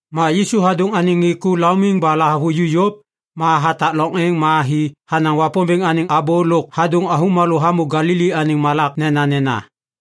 Ma Yisu hadôŋ anêŋ ŋê ku laumiŋ ba lahavuju yôv, ma hatak loŋ êŋ ma hi hanaŋ Wapômbêŋ anêŋ abô lôk hadôŋ avômalô hamô Galili anêŋ malak nenanena.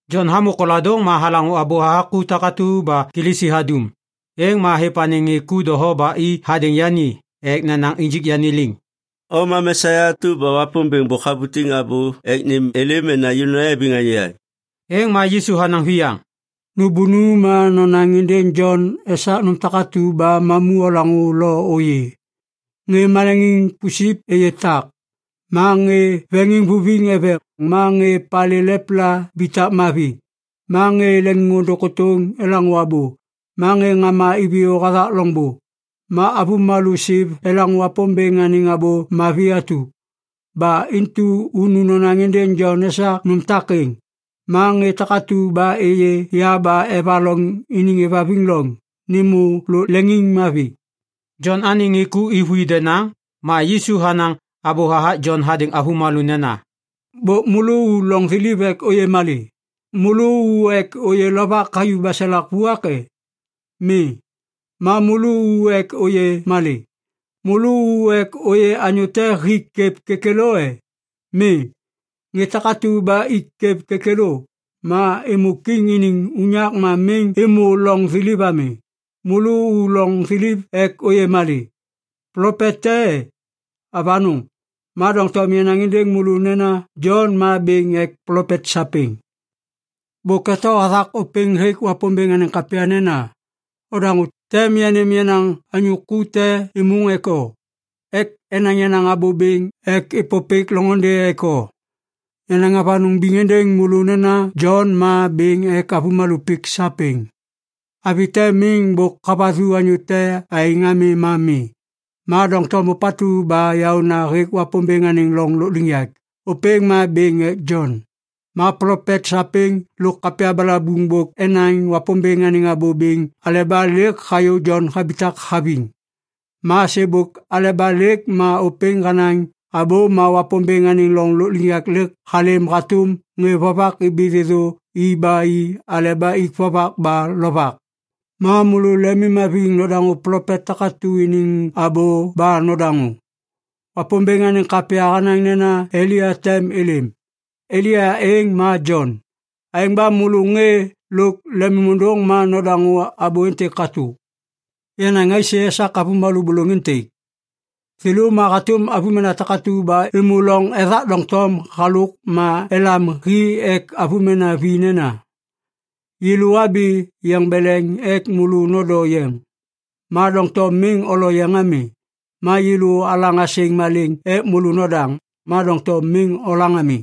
Jon hamô koladôŋ ma halaŋô abô hathak ku takatu ba Kilisi hadum. Êŋ ma hêv anêŋ ŋê ku doho ba i hadêŋ yani ek nenaŋ injik yani liŋ, “O ma Mesia atu ba Wapômbêŋ bôk habutiŋ abô ek nêm êlêm mena yêlô nayabiŋ anyô yaŋ?” Êŋ ma Yisu hanaŋ viyaŋ, “Nôbônu ma nonaŋ êndêŋ Jon esak nôm takatu ba mamu olaŋô lo ôyê. Ŋê maleŋiŋ pusip êyê tak, ma ŋê veŋiŋvuviŋ eveŋ, ma ŋê palê lepla ibitak mavi, ma ŋê leŋiŋôndôŋ kôtôŋ elaŋô abô, ma ŋê ŋama iviyô hathak loŋbô, ma avômalô siv elaŋô Wapômbêŋ anêŋ Abô Mavi atu. Ba intu unu nonaŋ êndêŋ Jon esak nôm takêŋ. Ma ŋê takatu ba êyê ya ba evaloŋ iniŋ êvhaviŋ loŋ, nêmô lôk leŋiŋmavi.” Jon anêŋ ŋê ku êvôi denaŋ, ma Yisu hanaŋ abô hathak Jon hadêŋ avômalô nena, “Bôk môlô u loŋ thiliv ek ôyê malê? Môlô u ek ôyê lovak hayuv baselak vuak e? Mi. Ma môlô u ek ôyê malê? Môlô u ek ôyê anyô te hik kwêv kêkêlô e? Mi. Ŋê takatu ba ik kwêv kêkêlô, ma êmô kiŋ iniŋ unyak ma miŋ êmô loŋ thiliv ami. Môlô u loŋ thiliv ek ôyê malê? Plopet te e? Avanôŋ! Ma doŋtom yanaŋ êndêŋ môlô nena Jon ma bêŋ ek plopet sapêŋ. Bôk eto hathak ôpêŋ hêk Wapômbêŋ anêŋ kapya nena, “‘Odaŋô, tem yanêm yenaŋ anyô ku te êmôŋ ek o, ek enaŋ yenaŋ abô bêŋ ek êpôpêk loŋôndê ek o.’ “Yanaŋ avanôŋ biŋ êndêŋ môlô nena Jon ma bêŋ ek avômalô pik sapêŋ. Avi te miŋ bôk havathu anyô te aêŋ ami ma mi. Ma doŋtom ôpatu ba yaôna hêk Wapômbêŋ anêŋ loŋ lôkliŋyak, ôpêŋ ma bêŋ ek Jon. “Ma plopet sapêŋ lôk kapya balabuŋ bôk enaŋ Wapômbêŋ anêŋ abô bêŋ aleba lêk hayô Jon habitak haviŋ. Ma sêbôk aleba lêk ma ôpêŋ hanaŋ abô ma Wapômbêŋ anêŋ loŋ lôkliŋyak halêm hatôm ŋê vovak ibi thêthô i ba i aleba ik vovak ba lovak. Ma môlô lemimhaviŋ nodaŋô plopet takatu iniŋ abô ba nodaŋô! Wapômbêŋ anêŋ kapya hanaŋ nena Elia tem êlêm. Elia êŋ ma Jon. Aêŋ ba môlô ŋê lôk lemôndôŋ ma nodaŋô abô êntêk katô! “Yanaŋ aisê esak avômalô bôlôŋ êntêk? Thêlô ma hatôm avômena takatu ba êmô loŋ ethak doŋtom halôk ma elam hi ek avômena vi nena, “‘Yêlô abi yeŋ beleŋ ek môlô nondo yeŋ, ma doŋtom miŋ olo yeŋ ami. Ma yêlô alaŋ asêŋ malêŋ ek môlô nodaŋ, ma doŋtom miŋ olaŋ ami.’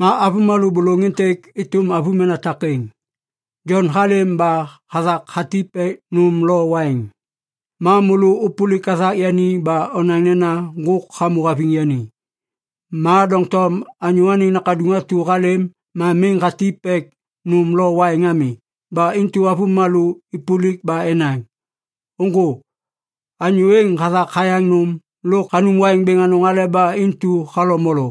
“Ma avômalô bôlôŋ êntêk êtôm avômena takêŋ. Jon halêm ba hathak hatip ek nôm lo waiŋ. Ma môlô ôpôlik hathak yani ba onaŋ nena ŋgôk hamô haviŋ yani. Ma doŋtom Anyô Anêŋ Nakaduŋ atu halêm ma miŋ hatip ek nôm lo waiŋ ami. Ba intu avômalô êpôlik ba enaŋ, ‘Ôŋgô! Anyô êŋ hathak hayaŋ nôm lôk hanum waiŋ bêŋ anôŋ aleba intu halo molo.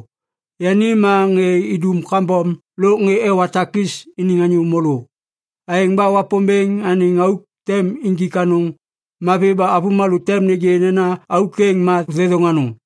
Yani ma ŋê idum kambom lôk ŋê ewa takis iniŋ anyô môlô.’ Aêŋ ba Wapômbêŋ anêŋ auk tem injik anôŋ mavi ba avômalô tem nêgê nena auk êŋ ma thêthôŋ anôŋ.”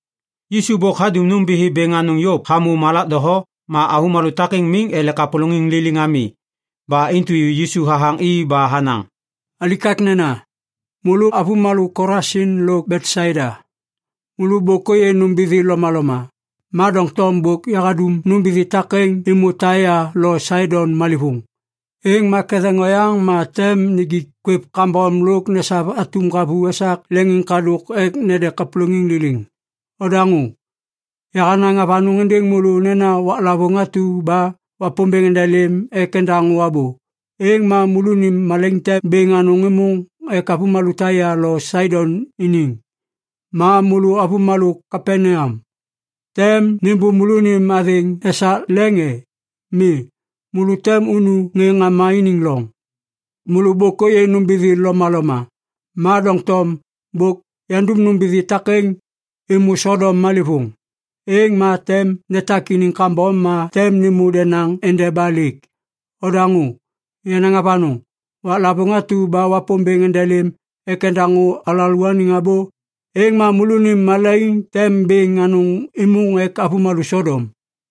Yisu bôk hadum nômbithi bêŋ anôŋ yôv hamô malak doho ma avômalô takêŋ miŋ ele kapôlôŋiŋ liliŋ ami. Ba intu Yisu hathaŋ i ba hanaŋ, “Alikaknena, môlô avômalô Kolasin lo Betsaida! Môlô bôk ôyê nômbithi lomaloma. Ma doŋtom bôk yandum nômbithi takêŋ êmô Taia lo Saidon malêvôŋ, êŋ ma ketheŋ oyaŋ ma tem nijik kwêv kambom lôk nesav atum ŋgavu esak leŋiŋkadôk ek nede kapôlôŋiŋ liliŋ. Odaŋô! Yahanaŋ avanôŋ êndêŋ môlô nena waklavôŋ atu ba Wapômbêŋ endelêm ek endaŋô abô, êŋ ma môlônim malaiŋ tem bêŋ anôŋ êmôŋ ek avômalô Taia lo Saidon iniŋ! “Ma môlô avômalô Kapaneam, tem nêmbô môlônim athêŋ esak leŋ e? Mi, môlô tem unu ŋê ŋama iniŋ loŋ! Môlô bôk ôyê nômbithi lomaloma. Ma doŋtom bôk yandum nômbithi takêŋ êmô Sodom malêvôŋ, êŋ ma tem netak iniŋ kambom ma tem nêmô denaŋ endeba lêk. Odaŋô! Yanaŋ avanôŋ! Waklavôŋ atu ba Wapômbêŋ endelêm ek endaŋô alalôaniŋ abô, êŋ ma môlônim malaiŋ tem bêŋ anôŋ êmôŋ ek avômalô Sodom!”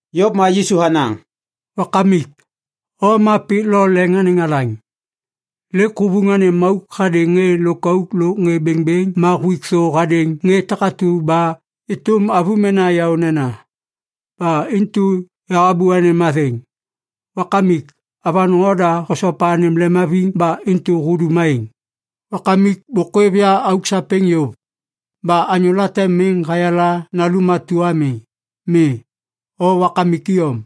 Yôv ma Yisu hanaŋ, “Wakamik, O ma pik lo leŋ anêŋ alaŋ! Lêk huvuŋ anêm auk hadêŋ ŋê lôkauk lôk ŋê bêŋbêŋ, ma huik thô hadêŋ ŋê takatu ba êtôm avômena yaônena. Ba intu yahabô anêm athêŋ! Wakamik, avanôŋ oda hosopa anêm lemhaviŋ ba intu hudum aêŋ. “Wakamik bôk hôêv ya auk sapêŋ yôv. Ba anyô late miŋ hayala Nalum atu ami. Mi, O Wakamik iyom.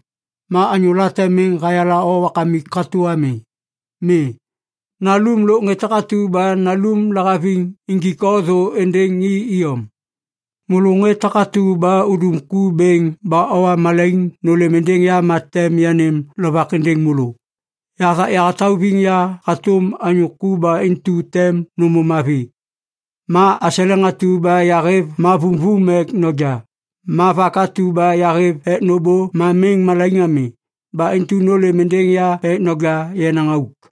Ma anyô late miŋ hayala O Wakamik katô ami. Mi, Nalum lôk ŋê takatu ba Nalum lahaviŋ injik O thô êndêŋ i iyom. “Môlô ŋê takatu ba udum ku bêŋ ba owa malaiŋ nôlêm êndêŋ ya ma tem yanêm lovak êndêŋ môlô. Yahathak yahatauviŋ ya hatôm anyô ku ba intu tem nômô mavi. Ma aseleŋ atu ba yahêv ma vumvum ek noja. Ma vak atu ba yahêv ek nôbô ma miŋ malaiŋ ami. Ba intu nôlêm êndêŋ ya ek noja yenaŋ auk.”